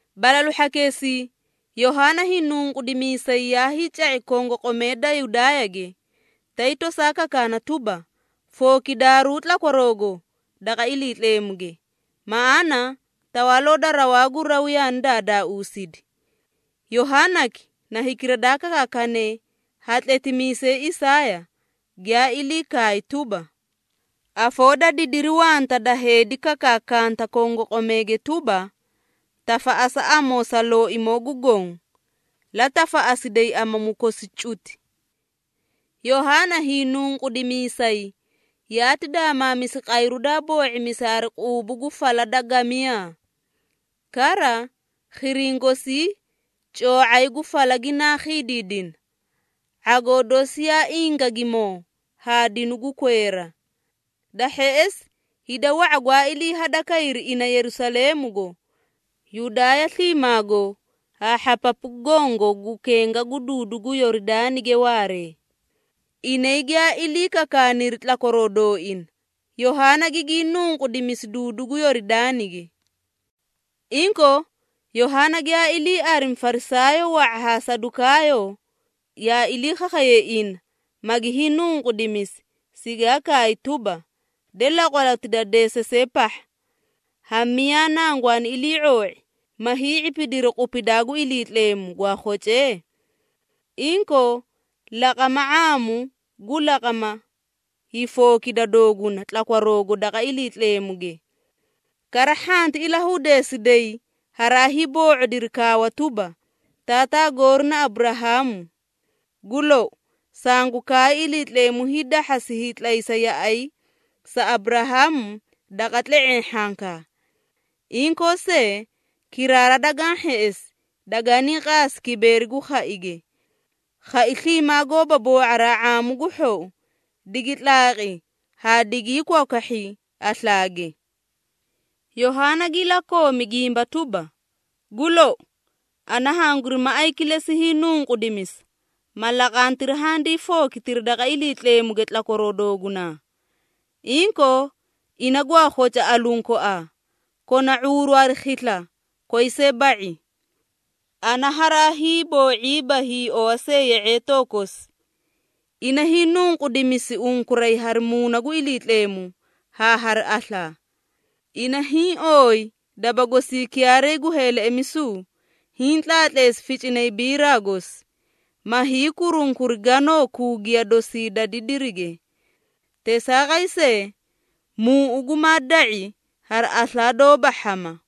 Balalu hhakeesii Yohaana Hiinunqudimiisay yaa hiica⁄i kongoqomee da Yudaayage, tay tosaa kakaana tuba, “Fookidaaruu tlakwaroogo daqa Iliitleemuge, maꞌaana Tawaaloo da rawaa gu raw yaani daadaausidi.” Yohaanaki na hikira daa kakaakane ha tletimiisay Isaaya, giyaa ilii kaay tuba, “Afoo da didiri wanta da heedi kakaakanta kongoqomeege tuba, ‘Tafaꞌasa amoo sa Looimoo gu Goõ, la tafaꞌasiday amamu kosi cuti!’” Yohaana Hiinunqudimiisay yaati daamaamisi qayru daa boo⁄imisi hari quubu gu fala da gamiyaa. Kara, khiriĩ gosii coo⁄ay gu fala ginaa khiidiidina. ⁄agoo dosi yaa ingagimoo haa dinu gu kweera. Da hheꞌesi, hida wa⁄a gwaa ilii hadakayri ina Yerusaleemugo, Yudaaya sliimaago haa hhapapu gongo gu kenga gu duudu gu Yoridaanige waaree. Inay giyaa ilii kakaaniri tlakwaroo dooina, Yohaana gigii nunqudimisi duudu gu Yoridaanige. Inkoo, Yohaana giyaa ilii arimi Farisaayoo wa⁄a haa Sadukaayoo, yaa ilii khakhayay ina, magi hiinunqudimisi, sigaa kaay tuba, “De, laqwaloti da deesasee pahha! Ha miyaa nangwaani ilii⁄oo⁄i, ma hii⁄ipidiri qupidaa gu Iliitleemu, gwaa khocee? Inkoo, laqama ⁄aamu gu laqama hiifookida dooguna tlakwaroogo daqa Iliitleemuge. Kara, hhanti ilahudeesiday haraa hiiboo⁄odiri kaawa tuba, ‘Taataa goori na Aburahaamu!’ Gu lou, sangu kaay Iliitleemu hiidahhasi hiitlaysa yaꞌay sa Aburahaamu daqa tle⁄eẽ hhankaa. Inkoo see, kiraara dagaã hheꞌesi, daganii qaasi kibeeri gu khaige! Khai sliimaa gooba boo⁄araa ⁄aamu gu hhou, digi tlaaqi haa digii kwakwahhi aslaage!” Yohaana gi ilakoomi gimba tuba, “Gu lou, ana hanguri maꞌay kilesi hiinunqudimisa, ma laqantiri handii fookitiri daqa Iliitleemuge tlakwaroo doogunaa. Inkoo, ina gwaa khoca aluũ koaa, kona ⁄uuru hari khisla koyi see ba⁄i. Ana haraa hiiboo⁄iiba hiiowa see ye⁄eetoo kosi! Ina hiinunqudimisi unkuray hari Muuna gu Iliitleemu haa hari aslaa. Ina hiĩ ooyi daba gosii kiyaaray gu heeleꞌemisu, hiĩ tlaatleesi ficinay biraa gosi, ma hiikurunkuri ganoo kuugiya dosii da didirige. Teesaaqay see, muuꞌu gumaa da⁄i hari aslaa doóba hhama!”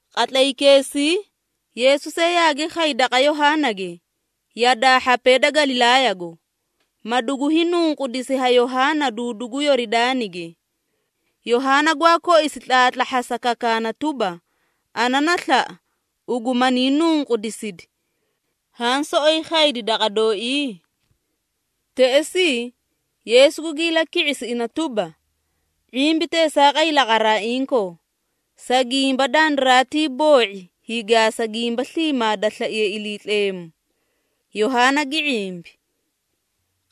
Qatlaykeesii Yeesu see yaagi khay daqa Yohaanage yadaa hhapee da Galilaayago, ma dugu hiinunqudisi ha Yohaana duudu gu Yoridaanige. Yohaana gwaa koisi tlaatlahhasa kakaana tuba, “Ana na slaꞌa, ugu hanii nunqudiside. Haã soꞌoyi khaydi daqa dooii?” Teꞌesii, Yeesu gugi ilaki⁄isi ina tuba, “⁄imbi teesaaqay laqaraa inkoo, sa gimba dandiraatii boo⁄i hiigaasa gimba sliimaa da slaiye Iliitleemu.” Yohaana gi ⁄imbi.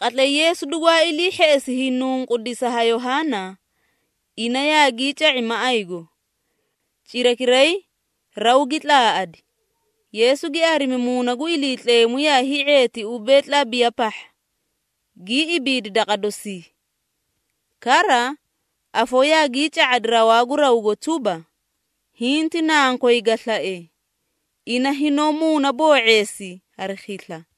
Qatlay Yeesu dugwaa ilii hheꞌesi hiinunqudisa ha Yohaana, ina yaagii ca⁄i maꞌaygo. Cirakiray, raw gi tlaaꞌadi, Yeesu gi arimi Muuna gu Iliitleemu yaa hii⁄eeti ubee, tlabiya pahha, gii ibiidi daqa dosii. Kara afoo yaagii ca⁄adi rawaa gu rawgo tuba, “Hiĩ ti Nankoy ga slae, ina hinoó muunaboo⁄eesi hari khisla.”